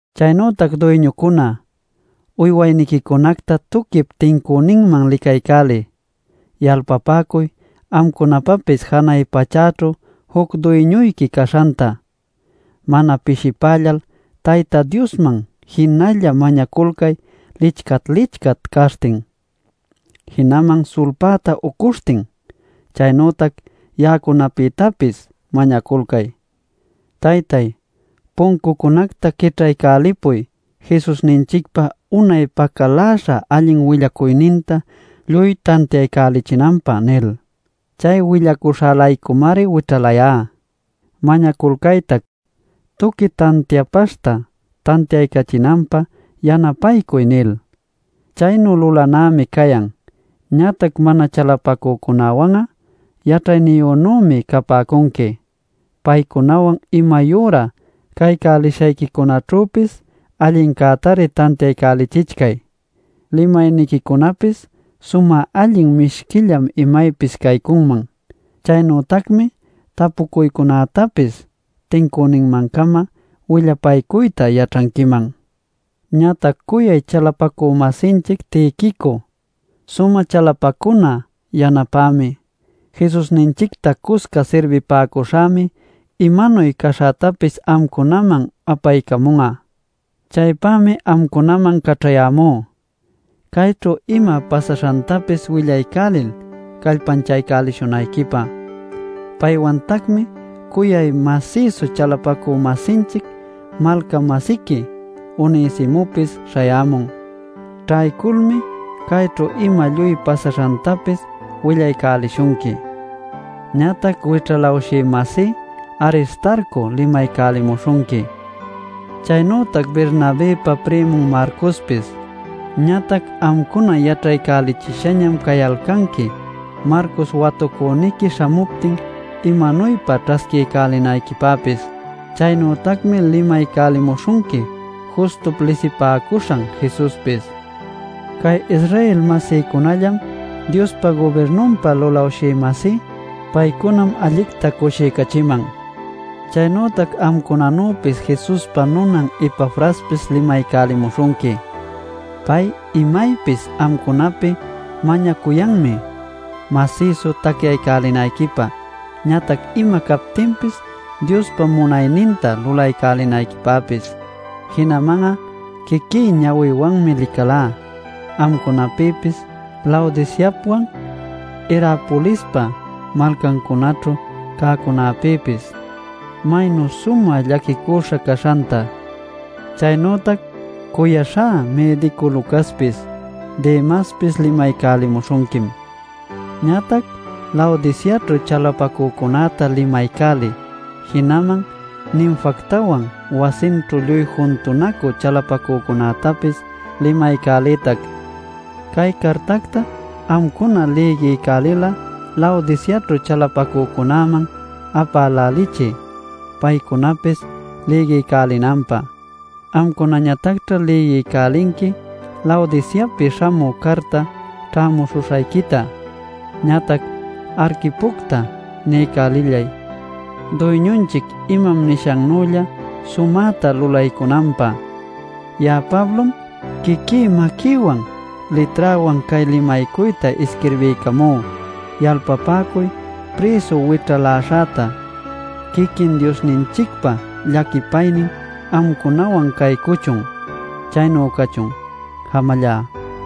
Chaynütac duyñucuna, uywayniquicunacta tuquip tincüninman licaycäliy. Yalpapäcuy amcunapapis janay pachäćhu juc duyñuyqui caśhanta. Mana pishipällal Tayta Diosman jinalla mañaculcay lichcat-lichcat caśhtin, jinaman sulpäta ucuśhtin. Chaynütac ya'acunapïtapis mañaculcay “Taytay, puncucunacta quićhaycälipuy Jesusninchicpa unay pacaläśhan allin willacuyninta lluy tantiaycälichinanpä” nil. Chay willacuśhä-laycumari wićhalayá. Mañaculcaytac “Tuqui tantiapaśhta tantiaycachinanpä yanapaycuy” nil; chaynu lulanämi cayan. Ñatac mana chalapacücunäwan'a yaćhayniyünümi capäcunqui; paycunawan imayüra caycälishayquicunaćhüpis allincätari tantiaycälichichcay. Limayniquicunapis sumä allin mishquillam imaypis caycunman. Chaynütacmi tapucuycunätapis tincüninman-cama willapaycuyta yaćhanquiman. Ñatac cuyay chalapacü-masinchic Tiquico, sumä chalapacuna yanapämi, Jesusninchicta cusca sirbipäcuśhämi imanuy caśhätapis amcunaman apaycamun'a. Chaypämi amcunaman caćhayämú, cayćhu ima pasaśhantapis willaycälil, callpanchaycälishunayquipä. Paywantacmi cuyay masïsu chalapacü-masinchic malca-masiqui Onesimopis śhayämun. Ćhayculmi cayćhu ima lluy pasaśhantapis willaycälishunqui. Ñatac wićhalawshï-masí Aristarco limaycälimuśhunqui, chaynütac Bernabëpa primun Marcospis. Ñatac amcuna yaćhaycälichishañam cayalcanqui Marcos watucüniqui śhamuptin imanuypa ćhasquiycälinayquipäpis. Chaynütacmi limaycälimuśhunqui Justup lisipäcuśhan Jesuspis. Cay Israel-masïcunallam Diospa gubirnunpa lulawshï-masí. Paycunam allicta cushiycachiman. Chaynütac amcunanüpis Jesuspa nunan Epafraspis limaycälimuśhunqui. Pay imaypis amcunapi mañacuyanmi, masïsu tacyaycälinayquipä ñatac ima captinpis Diospa munayninta lulaycälinayquipäpis. Jinaman'a quiquí ñawïwanmi licalá amcunapïpis Laodiceapwan Hierapolispa malcancunaćhu cäcunäpïpis, maynu sumä llaquicuśha caśhanta. Chaynütac cuyaśhá mïdicu Lucaspis, Demaspis limaycälimuśhunquim. Ñatac Laodiceaćhu chalapacücunäta limaycäliy. Jinaman Ninfactawan wasinćhu lluy juntunacü chalapacücunätapis limaycäliytac. Cay cartacta amcuna lïgiycälil'a Laodiceaćhu chalapacücunäman apälälichiy, paycunapis lïgiycälinanpä. Amcunañatacćha lïgiycälinqui Laodiceapi śhamü carta ćhämuśhuśhayquita. Ñatac Arquipocta niycälillay Duyñunchic imam nishannülla sumäta lulaycunanpä. Ya'a Pablom quiquí maquïwan, liträwan cay limaycuyta isquirbiycamú. Yalpapäcuy prïsu wićhaläśhäta. Quiquin Diosninchicpa llaquipaynin amcunawan caycuchun. Chaynu cachun. Jamallá.